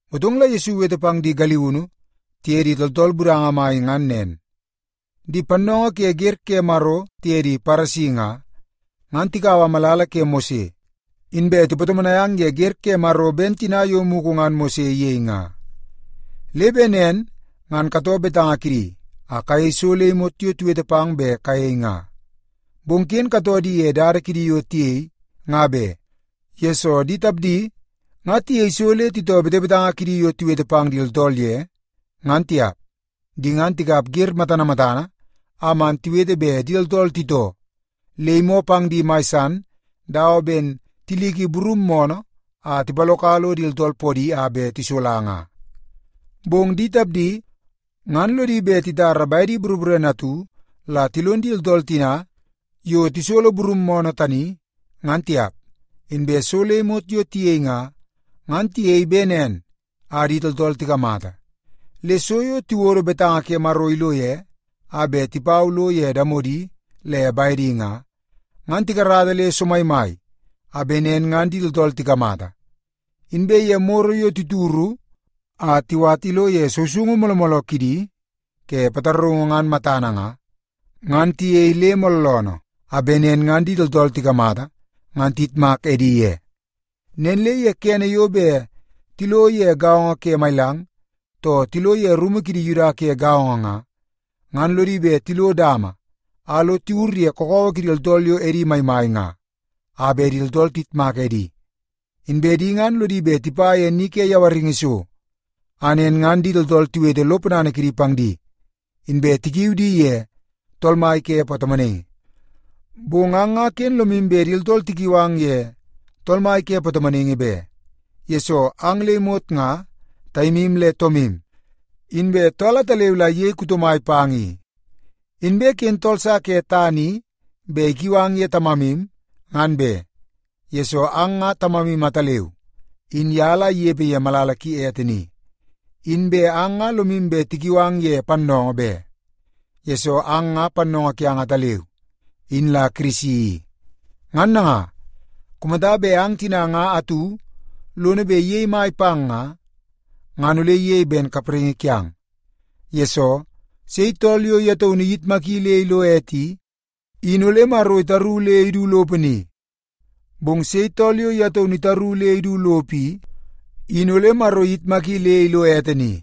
Motong la Yesu iwete pang di galiunu tiye di tooltool budanga mai ngan nen, “Di pannoongoo ke wer ke Maro tiye di Paresi nga, ngan tikaua malala ke Mose, inbe tipatomonai ang ye wer ke Maro ben tina yo mugu ngan Mose iyei nga. Le bet nen ngan katoo betanga kidi a kayei so le imot yo tiwete pang bet kayei nga. Bong ken katoo di ye dada kidi yo tiyei nga be, yesoo di tapdi nga tiyei so le titoo betebetanga kidi yo tiwetewete pang di tooltool ye, ngan tiap. Di ngan tikap wer matana matana a man tiwete bet di tooltool titoo, le imoo pang di mai san dawa ben tiliki burum moonoo a tipaloka lo di tooltool poopoodi a bet tisola nga. Bong di tapdi ngan lodi bet titara bedi boroborene atu la tilon di tooltool tina yo tisolo burum moonoo tani, ngan tiap. “Inbe so le imot yo tiyei nga, ngan tiyei bet nen a di tooltool tikamata. Le so yo tiwodo betanga ke Maro ilo ye, a bet tipau lo ye damodi le bedi nga, ngan tikarata le somaimai a bet nen ngan di tooltool tikamata. Inbe ye moro yo tituru a tiwat ilo ye sousoungu mooloo mooloo kidi ke pataraungu ngan matana nga, ngan tiyei le mooloonoo a bet nen ngan di tooltool tikamata, ngan tiyitmak edi ye. Nen le ye kene yo bet tilo ye gaongo ke mailang, too tilo ye rumu kidi Yuda ke gaongo nga, ngan lodi bet tilo dama a lo tiwur ye kakawa kidi tooltool yo edi maimai nga a bet di tooltool tiyitmak edi. Inbe di ngan lodi bet tipa ye ni ke yawaringi so, a nen ngan di tooltool tiwete lo ponana kidi pang di, inbe tikiu di ye ‘Tool mai ke Patomonaingi.’ “Bong ang nga ken lomu bet di tooltool tikiu ang ye ‘Tool mai ke Patomonaingi’ be, yesoo ang le imot nga taimu le toomu. Inbe tool ataleu la iyei kuto mai pang i. Inbe ken tool sa ke tana i bet ikiu ang ye ‘tamamu,’ ngan be, yesoo ang nga Tamamu ataleu, in ye la inepe ye malala ki ete ni. Inbe ang nga lomu bet tikiu ang ye ‘pannoongoo’ be, yesoo ang nga Pannoongoo kiang ataleu, in la Kirisi i. Ngan nanga, kumata bet ang tina nga atu lono bet iyei mai pang nga, ngan ole iyei ben kapraingi kiang. Yesoo, sei tool yo ye taunu iyitmaki le ilo ete i, in ole Maro itaru le idu lopo ni. Bong sei tool yo ye taunu itaru le idu lopo i, in ole Maro iyitmaki le ilo ete ni.”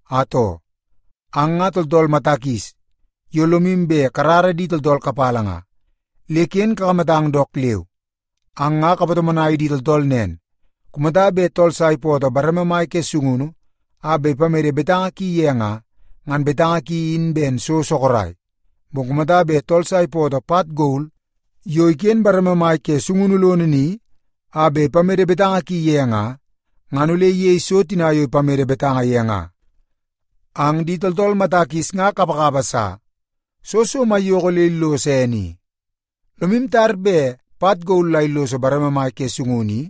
“Atoo, ang nga tooltool mata kis yo lomu bet karara di tooltool kapala nga, le ken kakamatang dook leu! Ang nga kapatomonai di tooltool nen, ‘Kumata bet tool sa ipootoo bareme mai ke sungunu a bet ipamede betanga ki ye nga, ngan betanga ki in ben so sorok. Bong kumata bet tool sa ipootoo pat gol yo iken bareme mai ke sungunu lono ni, a bet ipamede betanga ki ye nga, ngan ole iyei so tina yo ipamede betanga ye nga.’ Ang di tooltool mata kis nga kapakapa sa! Soo so maiyoko le illoso ene i? Lomu tar bet pat gol la illoso bareme mai ke sungunu i,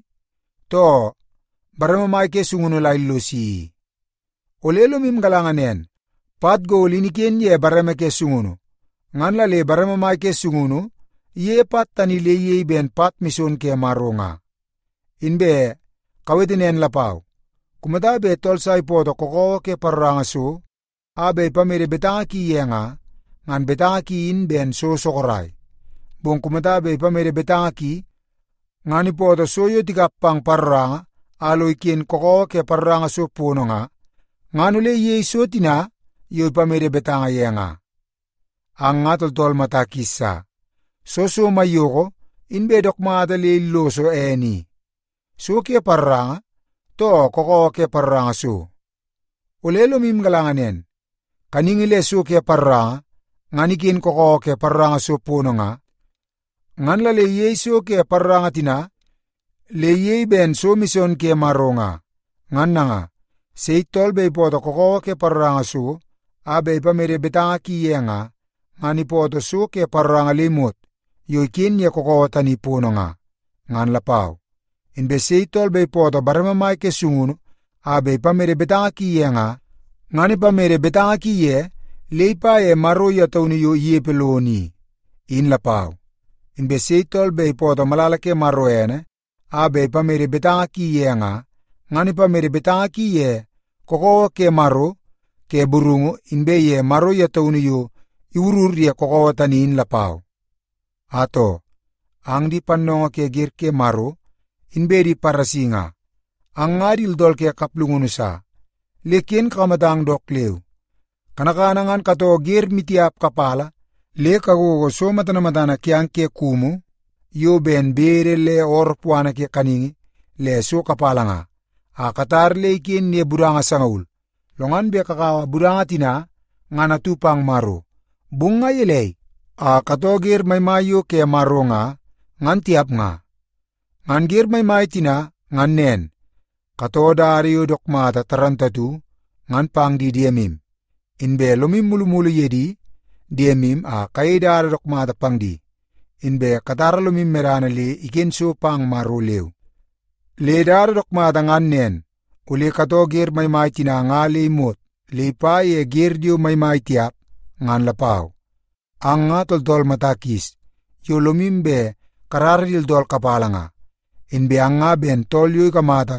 too bareme mai ke sungunu la illosi i? Ole lomu galanga nen, pat gol in iken ye bareme ke sungunu, ngan la le bareme mai ke sungunu iyeie pat tani le iyei ben pat mison ke Maro nga. Inbe kawete nen lapau, ‘Kumata bet tool sa ipootoo kakawa ke paroranga so a bet ipamede betanga ki ye nga, ngan betanga ki in ben so sorok. Bong kumata bet ipamede betanga ki ngan ipootoo so yo tikap pang paroranga a lo iken kakawa ke paroranga so pono nga, ngan ole iyei so tina yo ipamede betanga ye nga.’ Ang nga tooltool mata kis sa! Soo so maiyoko inbe dook mata le illoso ene i, so ke paroranga, too kakawa ke paroranga so? Ole lomu galanga nen, kaningi le so ke paroranga ngan iken kakawa ke paroranga so pono nga, ngan la le iyei so ke paroranga tina le iyei ben so mison ke Maro nga. Ngan nanga, sei tool bet ipootoo kakawa ke paroranga so a bet ipamede betanga ki ye nga, ngan ipootoo so ke paroranga le imot yo iken ye kakawa tani pono nga, ngan lapau. Inbe sei tool bet ipootoo bareme mai ke sungunu a bet ipamede betanga ki ye nga, ngan ipamede betanga ki ye le ipa ye Maro ye taunu yo inepe lono i, in lapau. Inbe sei tool bet ipootoo malala ke Maro ene a bet ipamede betanga ki ye nga, ngan ipamede betanga ki ye kakawa ke Maro ke burungu inbe ye Maro ye taunu yo iwurur ye kakawa tani in lapau. “Atoo, ang di pannoongoo ke wer ke Maro inbe di Paresi nga, ang nga di tooltool ke kaplungunu sa, le ken kakamatang dook leu! Kanakana ngan katoo wer maimai tiap kapala le kagogo so matana matana kiang ke kumu yo ben kudu le ooroo puana ke kaningi le so kapala nga, a katar le iken ye budanga sangaul, lo ngan bet kakaua budanga tina, ngan atu pang Maro. Bong nga gelei a katoo wer maimai yo ke Maro nga, ngan tiap nga? Ngan wer maimai tina ngan nen: kakarata betanga ke di diemu ye dada yo dook mata moolmool nga; inbe lomu mulumulu ye di diemu a kayei dada dook mata pang di; inbe katara lomu medana le iken so pang Maro leu. Le dook mata ngan nen, ole katoo wer maimai tina nga le imot le ipa ye wer yo maimai tiap, ngan lapau. Ang nga tooltool mata kis yo lomu bet karara di tooltool kapala nga. Inbe ang nga ben tool yo ikamata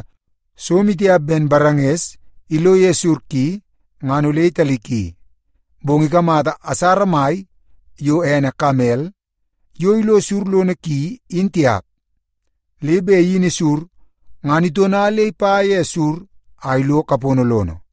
so maitiap ben baranges ilo ye sur ki, ngan ole italiki i. Bong ikamata asara mai yo ene kamel yo ilo sur lono ki, in tiap, le bet iyini sur ngan itona le ipa ye sur a ilo kapono lono.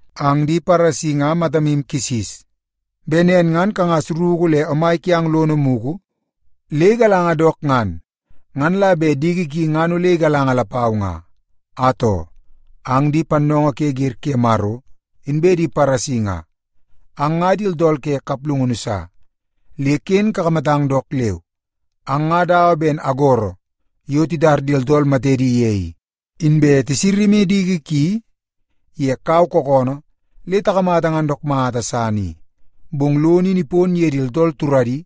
Ang di Paresi nga matamu kisis! Bet nen ngan kangas ruku le omai kiang lono mugu le igalanga dook ngan, ngan la bet diki ki ngan ole igalanga lapau nga. “Atoo, ang di pannoongoo ke wer ke Maro inbe di Paresi nga, ang nga di tooltool ke kaplungunu sa, le ken kakamatang dook leu! Ang nga dawa ben agoro yo titar di tooltool matedi ye i, inbe tisama diki ki ye kau kookoonoo le tikamata ngan dook mata san i. Bong lono in ipon ye di tooltool turadi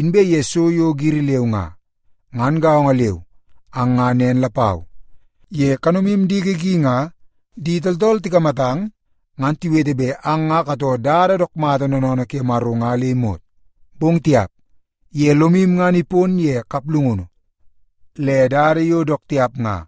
inbe ye so yo giri leu nga. Ngan gaongo leu, ang nga nen lapau. Ye kanomu diki ki nga di tooltool tikamatang, ngan tiwete bet ang nga katoo dada dook mata noonoonoo ke Maro nga le imot. Bong tiap, ye lomu ngan ipon ye kaplungunu le dada yo dook tiap nga.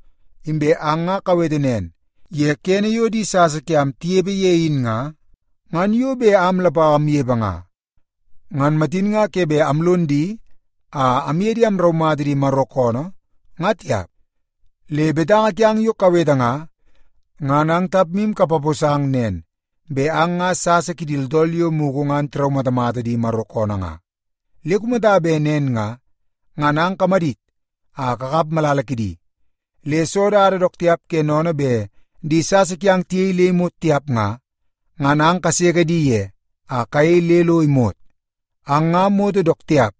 Inbe ang nga kawete nen, ‘Ye kene yo di sasa kiam tinepe ye in nga, ngan yo bet am lapau amnepe nga, ngan matin nga ke bet amlon di a amye di amraumata di Maro koonoo, nga tiap.’ Le betanga kiang yo kawete nga, ngan ang tapmu kapaposang nen, bet ang nga sasa kidi tooltool yo mugu ngan tiraumatamata di Maro koonoo nga. Le kumata bet nen nga, ngan ang kamadit a kakap malala kidi! Le soo dada dook tiap ke sennene bet di sasa kiang tiyei le imot tiap nga, ngan ang kaseke di ye a kayei le lo imot. “Ang nga moto dook tiap,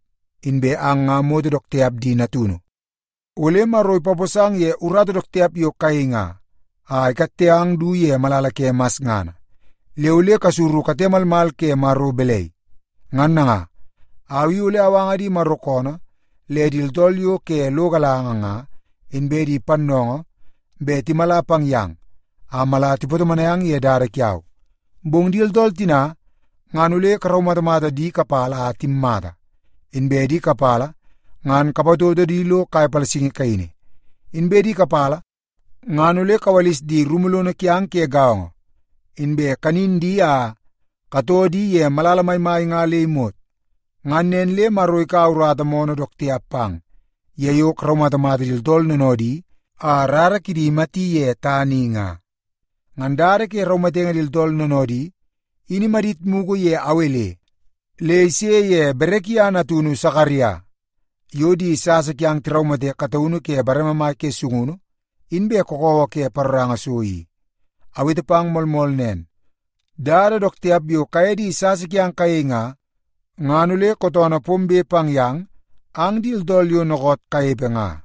inbe ang nga moto dook tiap di natunu! Ole Maro ipaposang ye urata dook tiap yo kayei nga, a ikatte ang du ye malala ke masngana. Le ole kasuru kate malmal ke Maro balai? Ngan nanga, au i ole awanga di Maro koonoo le di tooltool yo ke lo galanga nga inbe di pannoongoo bet timala pang yang a mala tipatomonai ang ye dada kiau. Bong di tooltool tina, ngan ole karaumatamata di kapala a timmata, inbe di kapala ngan kapatoto di tilo kai palasingi kaini, inbe di kapala ngan ole kawalis di rumu lono kiang ke gaongo, inbe kanin di a katoo di ye malala maimai nga le imot. Ngan nen le Maro ikaua urata moonoo dook tiap pang, ye yo karaumatamata di tooltool noonoodi a rara kidi imati ye tana i nga. Ngan dada ke raumatenge di tooltool noonoodi, in imadit mugu ye Awel le ise ye Berekia natunu Sakaria, yo di sasa kiang tiraumate kataunu ke bareme mai ke sungunu inbe kakawa ke paroranga so i. Awete pang moolmool nen, dada dook tiap yo kaye di sasa kiang kayei nga, ngan ole kootoonoo pombe pang yang ang di tooltool yo dookoot kanepe nga.”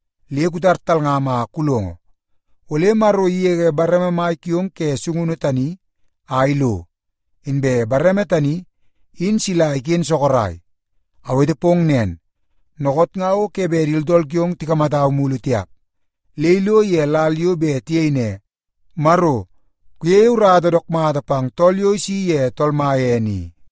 Le kutar talngam a kulongo, ole Maro igege bareme mai kiong ke sungunu tani a ilo, inbe bareme tani in sila iken sorok. Awete pong nen, dookoot nga o ke bet di tooltool kiong tikamatau mulu tiap, le ilo ye lal yo bet tiyei ne, ‘Maro kuyeie urata dook mata pang tool yo isi ye Tool Mai ene i.’”